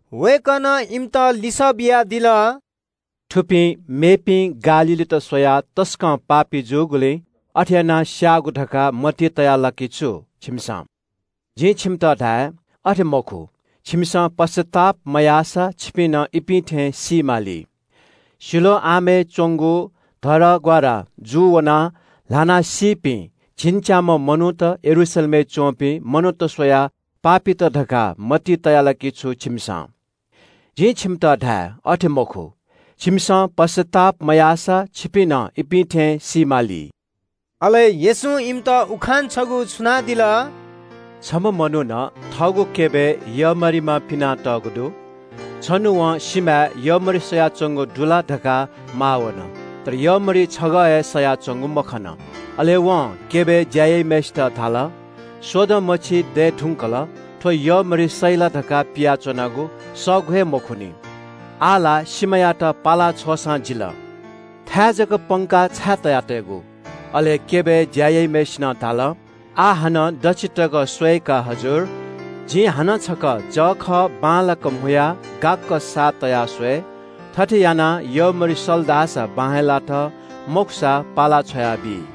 वय्कलं इमित लिसः बियादिल – “थुपिं मेपिं गालीलीत स्वयाः तसकं पापी जूगुलिं अथे यानाः स्याःगु धकाः मतिइ तया ला कि छु छिकपिन्सं? जिं छिकपिन्त धाये – अथे मखु, छिकपिन्सं पश्चाताप मयाःसा छिकपिं नं इपिं थें सी माली। सिलोआमय् च्वंगु धरहरा क्वःदलाः ल्हानाः सीपिं झिंच्याम्ह मनूत यरूशलेमय् च्वंपिं मनूत स्वयाः पापीत धकाः मतिइ तया ला कि छु छिकपिन्सं? जिं छिकपिन्त धाये – अथे मखु, छिकपिन्सं पश्चाताप मयाःसा छिकपिं नं इपिं थें सी माली।” अले येशूं इमित उखान छगू छुनादिल – “छम्ह मनुखं थःगु दाखया क्यबय् यःमरिमा पिनातःगु दु। छन्हु वं सिमाय् यःमरि सयाच्वंगु दु ला धकाः माः वन, तर यःमरि छगः हे सयाच्वंगु मखन। अले वं क्यबय् ज्या याइम्हय्सित धाल – ‘स्वदँ मछि दये धुंकल थ्व यःमरि सइ ला धकाः पियाच्वनागु, सःगु हे मखुनि। आः ला सिमायात पाला छ्वःसां जिल। थाय् जक पंक, छाय् तया तयेगु?’ “अले क्यबय् ज्या याइम्हय्सिनं धाल – ‘आः हानं दच्छि तक स्वये का हजुर। जिं हानं छकः जःखः बांलाक म्हुयाः गाक्क साः तयाः स्वये। थथे यानाः यःमरि सल धाःसा बां हे लात, मखुसा पाला छ्वयाबी।’”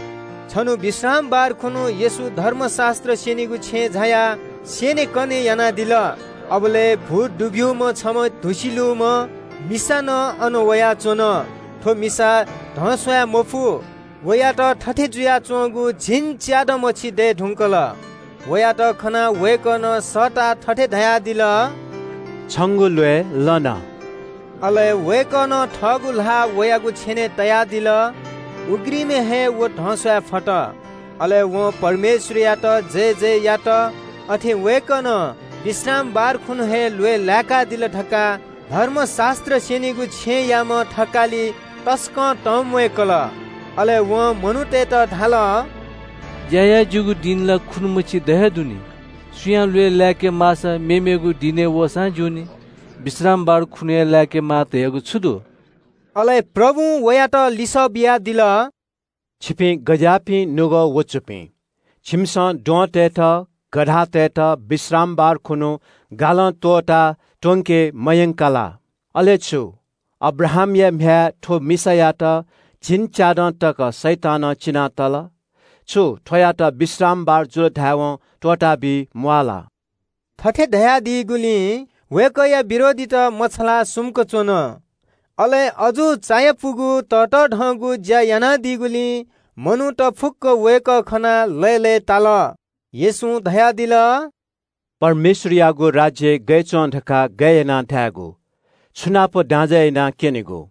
छन्हु विश्रामबार खुन्हु येशू धर्मशास्त्र स्यनीगु छेँय् झायाः स्यनेकने यानादिल। अबलय् भूत दुब्यूम्ह छम्ह धुसि लूम्ह मिसा नं अन वयाच्वन। थ्व मिसा धस्वाये मफु। वयात थथे जुयाच्वंगु झिंच्यादँ मछि दये धुंकल। वयात खनाः वय्कलं सःताः थथे धयादिल – “छिगु ल्वय् लन।” अले वय्कलं थःगु ल्हाः वयागु छेनय् तयादिल। उघ्रिमय् हे व धस्वाये फत। अले वं परमेश्वरयात जयजय यात। अथे वय्कलं विश्रामबार खुन्हु हे ल्वय् लाय्कादिल धकाः धर्मशास्त्र स्यनीगु छेँयाम्ह कजी तसकं तंम्वय्कल। अले वं मनूतय्त धाल – “ज्या याये ज्यूगु दिं ला खुन्हु मछि द हे दु नि। सुयां ल्वय् लाय्के माःसा उबलय् वःसां ज्यूनि। विश्रामबार खुन्हु हे लाय्केमाः धयागु छु दु?” अले प्रभुं वयात लिसः बियादिल – “छिकपिं गज्याःपिं निपाः ख्वाःपाः दुपिं? छिकपिन्सं द्वहंतय्त, गधातय्त विश्रामबार खुन्हु गलं त्वःताः लः त्वंके मयंका ला? अले छु, अब्राहामया म्ह्याय् थ्व मिसायात झिंच्यादँ तक शैतानं चिनातल। छु थ्वयात विश्रामबार जुल धायेवं त्वःताबी म्वाः ला?” थथे धयादीगुलिं वय्कःया विरोधीत मछालाः सुम्क च्वन। अले अजू चायापुगु ततःधंगु ज्या यानादीगुलिं ग्वाः ग्वाः मनूत वय्कः खनाः लय्लय्ताल। येशूं धयादिल – “परमेश्वरयागु राज्य गथे च्वं धकाः गय् यानाः धायेगु? छु नाप दाँजय् यानाः क्यनेगु?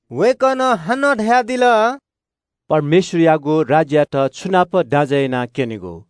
वय्कलं हानं धयादिल – “परमेश्वरयागु राज्ययात छु नाप दाँजय् यानाः क्यनेगु?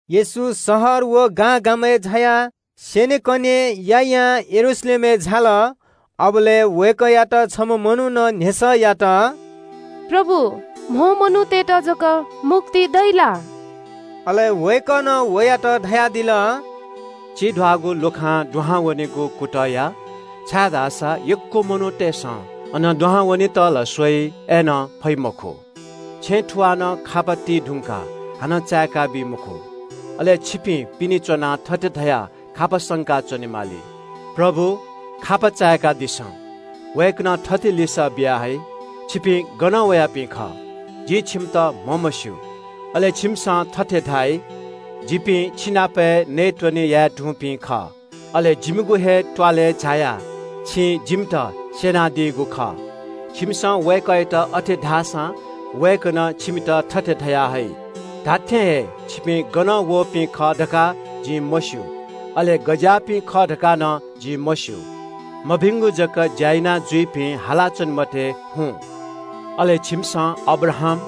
येशू शहर शहर व गां गां जुयाः स्यनेकने यायां यरूशलेमपाखे झाया च्वंबलय् वय्कःयात छम्ह मनुखं न्ह्यसः यात – “प्रभु, कम मनूतय्त जक मुक्ति दइ ला?” अले वय्कलं वयात धयादिल – “चिब्यागु लुखां दुहां वनेगु कुतः या, छाय्धाःसा यक्व मनूतय्सं अनं दुहां वनेत ला स्वइ, अय्नं फइ मखु। छेँ थुवालं खापा ति धुंकाः हानं चाय्काबी मखु। अले छिपिं पिने च्वनाः थथे धयाः खापा संका च्वनेमाली – ‘प्रभु, खापा चाय्कादिसँ।’ वय्कलं थथे लिसः बिया हइ – ‘छिपिं गनं वयापिं खः? जिं छिमित म्हमस्यू।’ अले छिमिसं थथे धाइ – ‘जिपिं छिनाप हे नयेत्वने याये धुंपिं खः। अले जिमिगु हे त्वालय् झायाः छिं जिमित स्यनादीगु खः।’ छिमिसं वय्कःयात अथे धाःसां वय्कलं छिमित थथे धया हइ – ‘धात्थें हे छिपिं गनं वःपिं खः धकाः जिं मस्यू। अले गज्याःपिं खः धकाः नं जिं मस्यू। मभिंगु जक ज्या यानाजुइपिं, हालाच्वने मते, हुँ।’ “अले छिमिसं अब्राहाम,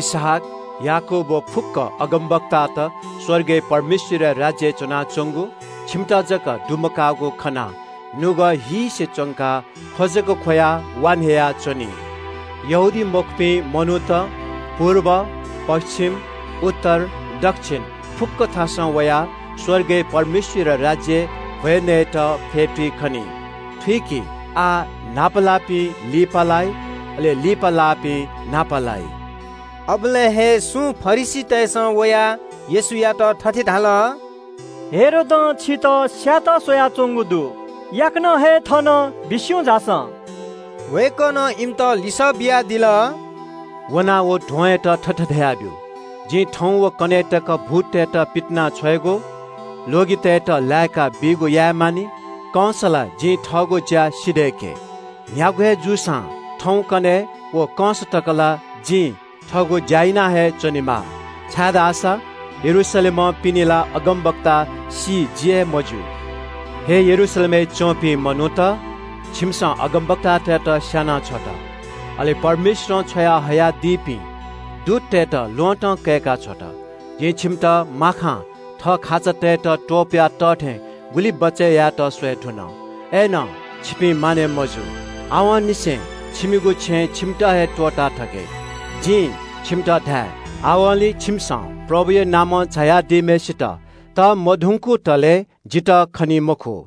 इसहाक, याकूब व फुक्क अगमवक्तात स्वर्गय् परमेश्वरया राज्यय् च्वनाच्वंगु, छिमित जक दुमकाःगु खनाः नुगः हीसे च्वंकाः ख्व जक ख्वयाः, वा न्ह्ययाच्वनी। यहूदीमखुपिं मनूत पुर्ब, पच्छिम, उत्तर, दच्छिन फुक्क थासं वयाः स्वर्गय् परमेश्वरया राज्यय् भ्वय् नयेत फ्यतुइ खनी। थुइकि, आः न्हापा लाःपिं लिपालाइ, अले लिपा लाःपिं न्हापा लाइ।” अबलय् हे सुं फरिसीतय्सं वयाः येशूयात थथे धाल – “हेरोदं छितः स्यायेत स्वयाच्वंगु दु, याकनं हे थनं बिस्युं झासँ।” वय्कलं इमित लिसः बियादिल – “झासँ व ध्वंयात थथे धयादिसँ – जिं थौं व कन्हय् तक भूततय्त पितिनाछ्वयेगु, ल्वगितय्त लाय्काबीगु याये मानि, कंस ला जिं थःगु ज्या सिधय्के। न्ह्यागु हे जूसां थौं, कन्हय् व कंस जि थःगु लँय् वना हे च्वनेमाः छाय्धाःसा यरूशलेमं पिने ला अगमवक्ता सी जि हे मज्यू।” “हे यरूशलेमय् च्वंपिं मनूत, छिमिसं अगमवक्तातय्त स्याना छ्वत, अले परमेश्वरं छ्वयाहयादीपिं दूततय्त ल्वहँतं कय्काः स्याना छ्वत। जिं छिमित माखां थः खाचातय्त त्वपुया तः थें गुलि बचय् यायेत स्वये धुन। अय्नं छिपिं मानय् मजू। आवंनिसें छिमिगु छेँनं छिमित हे त्वःताथके। जिं छिमित धाये – आवंलि छिमिसं प्रभुया नामं झायादीम्हय्सित तःमधंकुतले जितः खनी मखु।”